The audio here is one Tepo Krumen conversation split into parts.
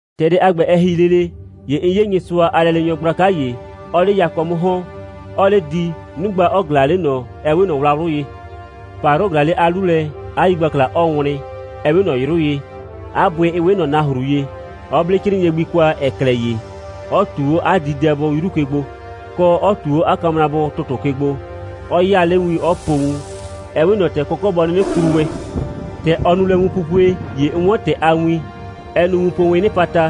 ‑Tɛ dɛ a ‑gbɛ, ɛ ‑hi lele, ‑ye 'n 'ye Nyɩsʋa a lɛleenyɔ gblaka ‑ye, 'ɔɔ 'le yakɔ 'mʋ ‑hɔn, 'ɔɔ 'le di, 'nugba 'ɔ ꞊glaa 'le ꞊nɔ, ‑ɛ 'we ꞊nɔ wlawlʋ ye. ‑Payrʋ ꞊glaa 'le 'a 'lu lɛ, 'a yigbakla 'ɔɔ wlɩn, ‑ɛ 'we ꞊nɔ 'yrʋ ye, 'a bʋɩ 'ɩ 'we ꞊nɔ nahru ye, 'ɔ 'ble 'crɩɩnɩɛ gbi kwa, ‑ɛ klɛ ye, 'ɔ ꞊tu 'o 'a diidɛbʋ 'yru ke gbo, kɔ, 'ɔ ꞊tu 'o 'a kamrabʋ ‑tʋtʋ ke gbo, 'ɔ 'yaa 'le win, 'ɔ po wun, ‑ɛ 'we ꞊nɔ ‑tɛ kɔkɔ' bɔ 'nɩnɩ klu wɛn. ‑Tɛ ɔ nu lɛ wunpupue, ‑ye 'n 'wɔn ‑tɛ a win, 'ɛ nu wunpowiin 'nɩpata,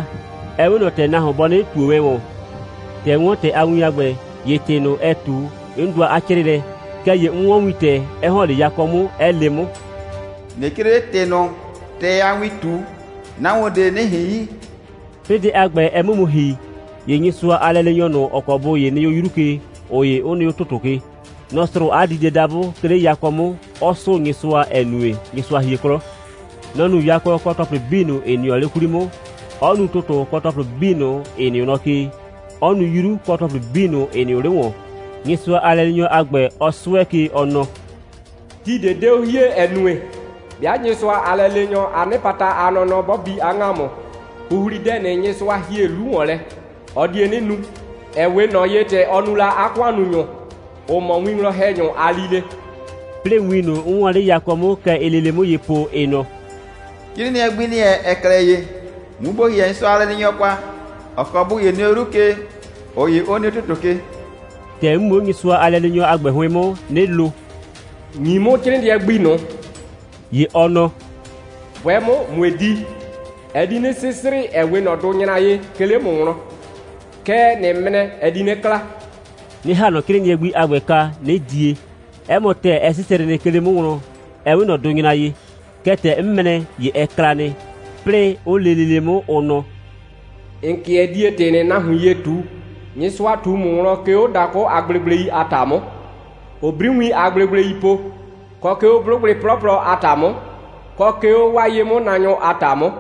‑ɛ 'we ꞊nɔ ‑tɛ nahuon bɔ 'nɩnɩ ꞊tuo wɛn ‑wɔn. ‑Tɛ 'n 'wɔn ‑tɛ a win a ‑gbɛ, ‑ye ‑tɩ ꞊nʋ, ɛ ꞊tu, 'n dʋa 'a 'crɩɩlɛ. Kɛɛ ‑ye 'n 'wɔn wintɛ, 'ɛ ‑hɔn 'le yakɔ 'mʋ, 'ɛ le 'mʋ: «꞊Nɩ 'crɩɩ 'le ‑tɩ ꞊nʋ, ‑tɛ a win ꞊tu, nahuon ꞊de 'nɩ ꞊hin yi.» 'Plɩɩ dɛ a ‑gbɛ, ɛ 'mʋ mu ‑hi, ‑ye Nyɩsʋa a lɛleenyɔ ꞊nʋ, ‑ɔ kɔ bʋ ‑ye nɩ 'o 'yru ke, ꞊ʋ ‑ye 'ʋ nɩ 'o ‑tʋtʋ ke, nɔ‑ srʋʋ 'a diidɛdabʋ, 'ke 'le yakɔ 'mʋ, 'ɔ 'sʋʋ Nyɩsʋa, ‑ɛ nue, Nyɩsʋa hie 'klɔ. Nɔ‑ nu yakɔ kɔ ‑tɔplɩ 'bii ꞊nʋ, ‑ɩ nɩɔ 'le 'kwli 'mʋ, 'ɔ nu ‑tʋtʋ kɔ ‑tɔplɩ 'bii ꞊nʋ, ‑ɩ nɩʋ nɔ ke, 'ɔ nu 'yru kɔ ‑tɔplɩ 'bii ꞊nʋ, ‑ɩ nɩʋ 'le ‑wɔn, Nyɩsʋa a lɛleenyɔ a ‑gbɛ, 'ɔ 'sʋɛ ke, ɔ nɔ: «Ti ꞊de 'de 'o hie, ‑ɛ nue, 'bɩa Nyɩsʋa a lɛleenyɔ a 'nɩpata a nɔnɔ 'bɔ bi 'a ‑ŋamʋ, ‑huhlidɛ ꞊nʋ, Nyɩsʋa ‑hie 'lu ‑wɔn lɛ, ɔ die 'nɩ nu, ‑ɛ 'we ꞊nɔ ye, ‑tɛ ɔ nu la 'a ‑kʋannunyʋ, ‑ʋ mɔ 'a winwlɔn‑hɛnyʋ a lile.» 'Plɩɩ win ꞊nʋ, 'n 'wɔɔn 'le yakɔ 'mʋ, kɛ ɩɩ lele 'mʋ ye po, ɩ nɔ: «'Crɩɩnɩɛ gbi ‑nɩ wɛn, ‑ɛ klɛ ye, mu ‑bo ‑hɩɛ Nyɩsʋa a lɛleenyɔ ꞊nʋ kwa, ‑ɔ kɔ bʋ ‑ye nɩ 'o 'yru ke, ꞊ʋ ‑ye 'ʋ nɩ 'o ‑tʋtʋ ke.» ‑Tɛ 'n mu 'o Nyɩsʋa a lɛleenyɔ a ‑gbɛ 'hʋɩn 'mʋ, 'nɩ lo: «‑Nyi 'mʋ 'crɩɩnɩɛ gbi ꞊nʋ.» ‑Ye ɔ nɔ: «'Bʋɛ 'mʋ, ꞊mue di. Ɛ di 'nɩ 'sɩsrɩ, ‑ɛ 'we ꞊nɔ dʋnyra ye, 'ke 'le ‑mʋ wlɔn. Kɛɛ, ꞊nɩ mrɛ, ɛ di 'nɩ kla,» 'nɩ ‑ha ꞊nɔ 'crɩɩnɩɛ gbi a ‑gbɛ kwa, 'nɩ die. 'Ɛ mɔ ‑tɛɛ, ɛ 'sɩsrɩ nɩ, 'ke 'le 'mʋ wlɔn, ‑ɛ 'we ꞊nɔ dʋnyra ye. Kɛɛ, ‑tɛ 'n mrɛ, ‑ye ɛ kla nɩ. 'Plɩɩ, 'ʋ le lele 'mʋ, ʋ nɔ: «‑N 'kɩɛ die ‑tɩ ꞊nʋ nahuin ye ꞊tu, Nyɩsʋa ꞊tu ‑mʋ wlɔn, 'ke 'o dakʋ a gblegblei a ‑ta 'mʋ, ‑ʋʋ 'briwiin a gblegblei po, kɔ 'ke 'o 'blʋgbɩ 'plɔplɔ a ‑ta 'mʋ, kɔ 'ke 'o 'waa ye'mʋnaanyʋ a ‑ta 'mʋ.»